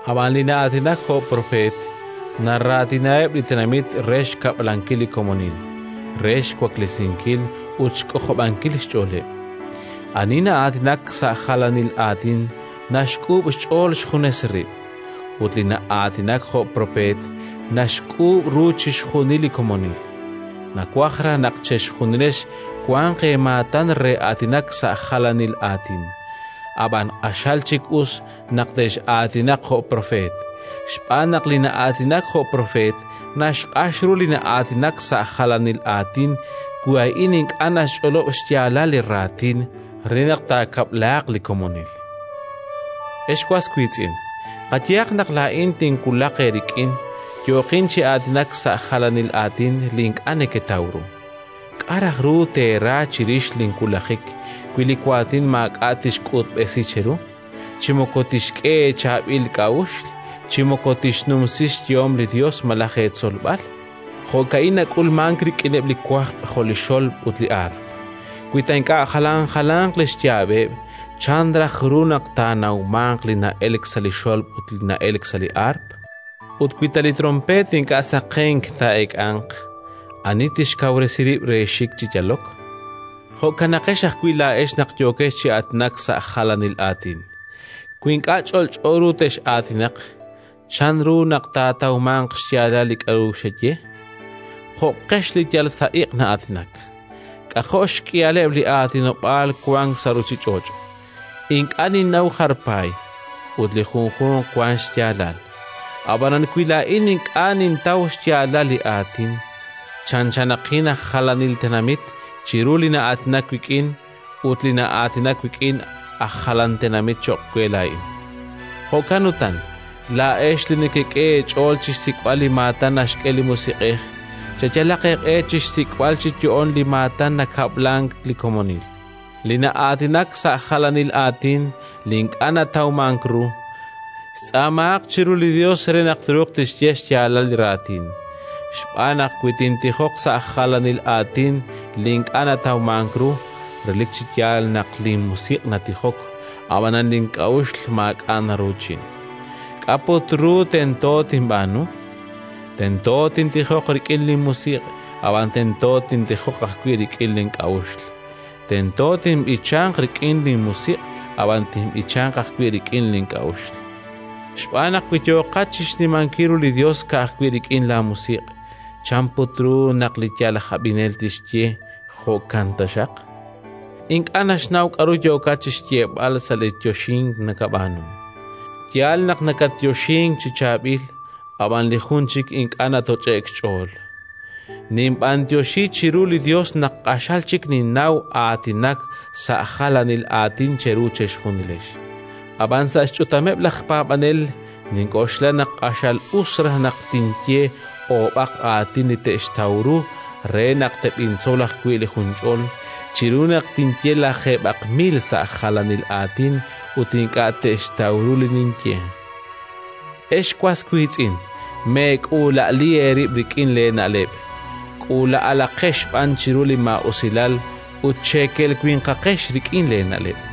Ab'an li na'aatinak jo' propeet naraatinaheb' li tenamit re xkab'lankil li komonil, re xwaklesinkil ut xk'ojob'ankil xch'ooleb'. Ani na'aatinak sa' jalanil aatin naxk'uub' xch'ool xjunes rib'; ut li na'aatinak jo' propeet naxk'uub' ru chixjunil li komonil. Nawaj raj naq chejunilex wanq eemaatan re aatinak sa' jalanil aatin, ab'an q'axal chik us naq tex'aatinaq jo' propeet. Xb'aan naq li na'aatinak jo' propeet naxq'ax ru li na'aatinak sa' jalanil aatin wi a'in ink'a' naxch'olob' xyaalal li raatin, re naq taakab'laaq li komonil. Ex was wiitz'in, qayehaq naq laa'in tinwulaq eerik'in, yooqin chi aatinak sa' jalanil aatin li ink'a' neketaw ru: k'a' raj ru teera chirix linwulajik, wi li waatin maak'a' tixk'utb'esi cheru, chi moko tixk'e eechaab'il k'a'uxl, chi moko tixnumsi xyehom li Yos malaj eetzolb'al? Jo'ka'in nak'ulmank rik'ineb' li wajb' jo' li xolb' ut li aarp. Wi ta ink'a' jalan jalanq li xyaab'eb', chan raj ru naq taanawmanq li na'elk sa' li xolb' ut li na'elk sa' li aarp? Ut wi ta li tronpeet ink'a' saqenk taa'eek'anq, ani tixkawresi rib' re xik chi yalok? Jo'kanaqex ajwi' laa'ex naq yooqex chi aatinak sa' jalanil aatin: wi ink'a' ch'olch'o ru tex'aatinaq, chanru naq taatawmanq xyaalal li k'aru xeye? Jo'qex li yal sa' iq' na'aatinak. K'ajo' xk'ihaleb' li aatinob'aal wank sa' ruuchich'och'! Ink'a' ninnaw jar paay, ut li junjunq wank xyaalal. Ab'anan wi laa'in ink'a' nintaw xyaalal li aatin, chanchanaqin aj jalanil tenamit chiru li na'aatinak wik'in; ut li na'aatinak wik'in, aj jalan tenamit cho'q we laa'in. Jo'kan utan, laa'ex li nekek'e eech'ool chi xsik'b'al li maatan naxk'e li Musiq'ej cheyalaq eeq'e chi xsik'b'al chi yo'oon li maatan nakab'lank li komonil. Li na'aatinak sa' jalanil aatin li ink'a' natawmank ru, xtz'aamahaq chiru li Yos re naq truuq tixye xyaalal li raatin. Xb'aan naq wi nintijok sa' jalanil aatin li ink'a' natawmank ru, relik chi yaal naq linmusiq' natijok, ab'anan link'a'uxl maak'a' naruuchin. K'a' put ru tento tinb'aanu? Tento tintijoq rik'in linmusiq', ab'an tento tintijoq ajwi' rik'in link'a'uxl. Tento tinb'ichanq rik'in linmusiq', ab'an tinb'ichanq ajwi' rik'in link'a'uxl. Xb'aan naq wi yooqat chi xnimankil ru li Yos ka'ajwi' rik'in laamusiq', chan put ru naq li yal aj ab'inel tixye: “Jo'kan taxaq”? Ink'a' naxnaw k'aru yookat chi xyeeb'al sa' li yoxink nakab'aanu. Yaal naq nakatyoxink chi chaab'il, ab'an li jun chik ink'a' natoch'e'k xch'ool. Ninb'anyoxi chiru li Yos naq q'axal chik ninnaw aatinak sa' jalanil aatin cheru chejunilex; ab'an sa' xch'utameb' laj paab'anel nink'oxla naq q'axal us raj naq tinye oob'aq aatin li te'xtaw ru re naq teb'intzol ajwi' li junch'ol, chiru naq tinye lajeeb'aq mil sa' jalanil aatin ut ink'a' te'xtaw ru li ninye. Ex was wiitz'in, meek'uula'ali eerib' rik'in leena'leb'; k'uula'alaqex b'an chiru li maa'usilal, ut cheekel winqaqex rik'in leena'leb'.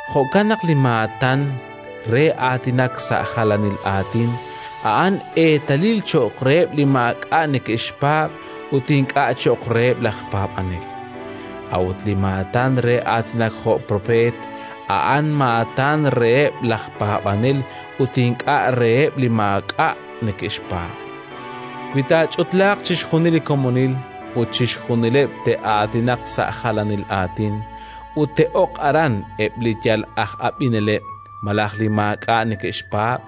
Jo'kan naq li maatan re aatinak sa' jalanil aatin a'an eetalil cho'q reheb' li maak'a' neke'xpaab' ut ink'a' cho'q reheb' laj paab'anel. A'ut li maatan re aatinak jo' propeet a'an maatan reheb' laj paab'anel ut ink'a' reheb' li maak'a' neke'xpaab'. Wi taach'utlaaq chixjunil li komonil, ut chixjunileb' te'aatinaq sa' jalanil aatin, ut te'ok aran eb' li yal aj ab'ineleb' malaj li maak'a' neke'xpaab',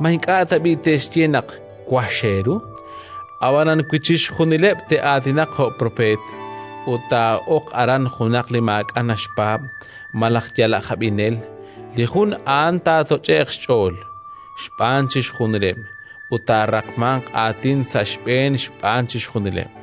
ma ink'a' tab'i' te'xye naq wax eeru? Ab'anan wi chixjunileb' te'aatinaq jo' propeet ut taa'ok aran junaq li maak'a' naxpaab' malaj yal aj ab'inel, li jun a'an taatoch'e'q xch'ool xb'aan chixjunileb' ut taaraqmanq aatin sa' xb'een xb'aan chixjunileb'.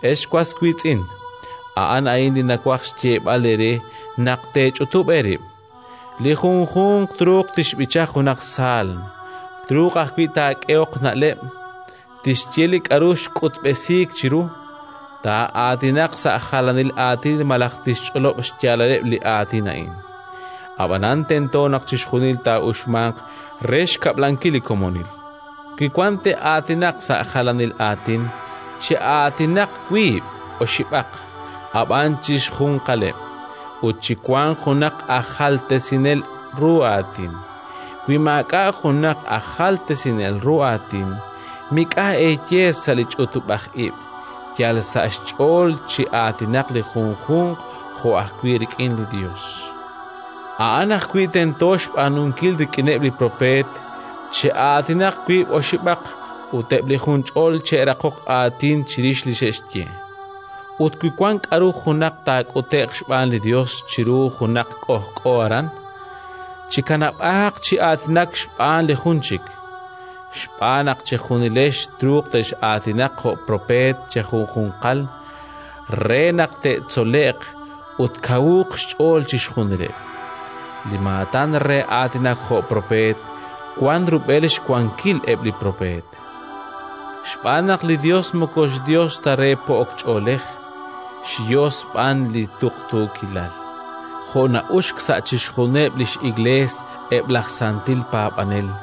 Ex was wiitz'in, a'an a'in li nawaj xyeeb'al eere: naq teech'utub' eerib', li junjunq truuq tixb'icha junaq saalm; truuq ajwi' taak'ehoq na'leb', tixye li k'aru xk'utb'esiik chiru, taa'aatinaq sa' jalanil aatin malaj tixch'olob' xyaalal eb' li aatin a'in. Ab'anan tento naq chixjunil taa'uxmanq re xkab'lankil li komonil. Wi wan te'aatinaq sa' jalanil aatin, che'aatinaq wiib' oxib'aq, ab'an chixjunqaleb'; ut chiwanq junaq aj jaltesinel ru aatin. Wi maak'a' junaq aj jaltesinel ru aatin, mik'a' eeye sa' li ch'utub'aj ib': yal sa' xch'ool chi'aatinaq li junjunq jo' ajwi' rik'in li Yos. A'an ajwi' tento xb'aanunkil rik'ineb' li propeet: che'aatinaq wiib' oxib'aq ut eb' li junch'ol che'raqoq aatin chirix li xe'xye. Ut wi wan k'aru taak'ute'q xb'aan li Yos chiru junaq k'ojk'o aran, chikanab'aaq chi aatinak xb'aan li jun chik. Xb'aan naq chejunilex truuq tex'aatinaq jo' propeet chejunjunqal re naq te'tzole'q ut tkawuuq xch'ool chixjunileb'. Li maatan re aatinak jo' propeet wank rub'el xwankil eb' li propeet, xb'aan naq li Yos moko Yos ta re po'ok ch'oolej, xYos b'an li tuqtuukilal. Jo' na'uxk sa' chixjunileb' li x'Iklees eb' laj santil paab'anel,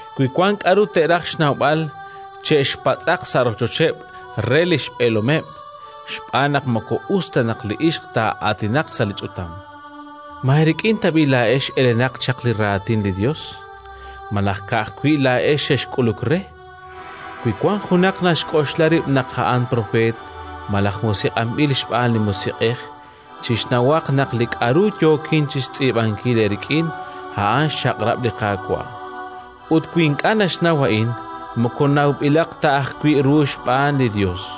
Wi wank k'aru te'raj xnawb'al, che'xpatz'aq sa' rochocheb' re li xb'eelomeb', xb'aan naq moko us ta naq li ixq taa'aatinaq sa' li ch'utam. Ma eerik'in tab'i' laa'ex elenaq chaq li Raatin li Yos? Malaj ka'ajwi' laa'ex xexk'uluk re? Wi wan junaq naxk'oxla rib' naq a'an propeet malaj musiq'anb'il xb'aan li Musiq'ej, chixnawaq naq li k'aru yookin chi xtz'iib'ankil eerik'in, a'an xchaq'rab' li Qaawa'. Ut wi ink'a' naxnaw a'in, moko nawb'ilaq ta ajwi' ru xb'aan li Yos.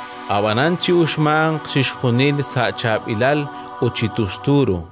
Ab'anan chi'uxmanq chixjunil sa' chaab'ilal ut chi tustu ru.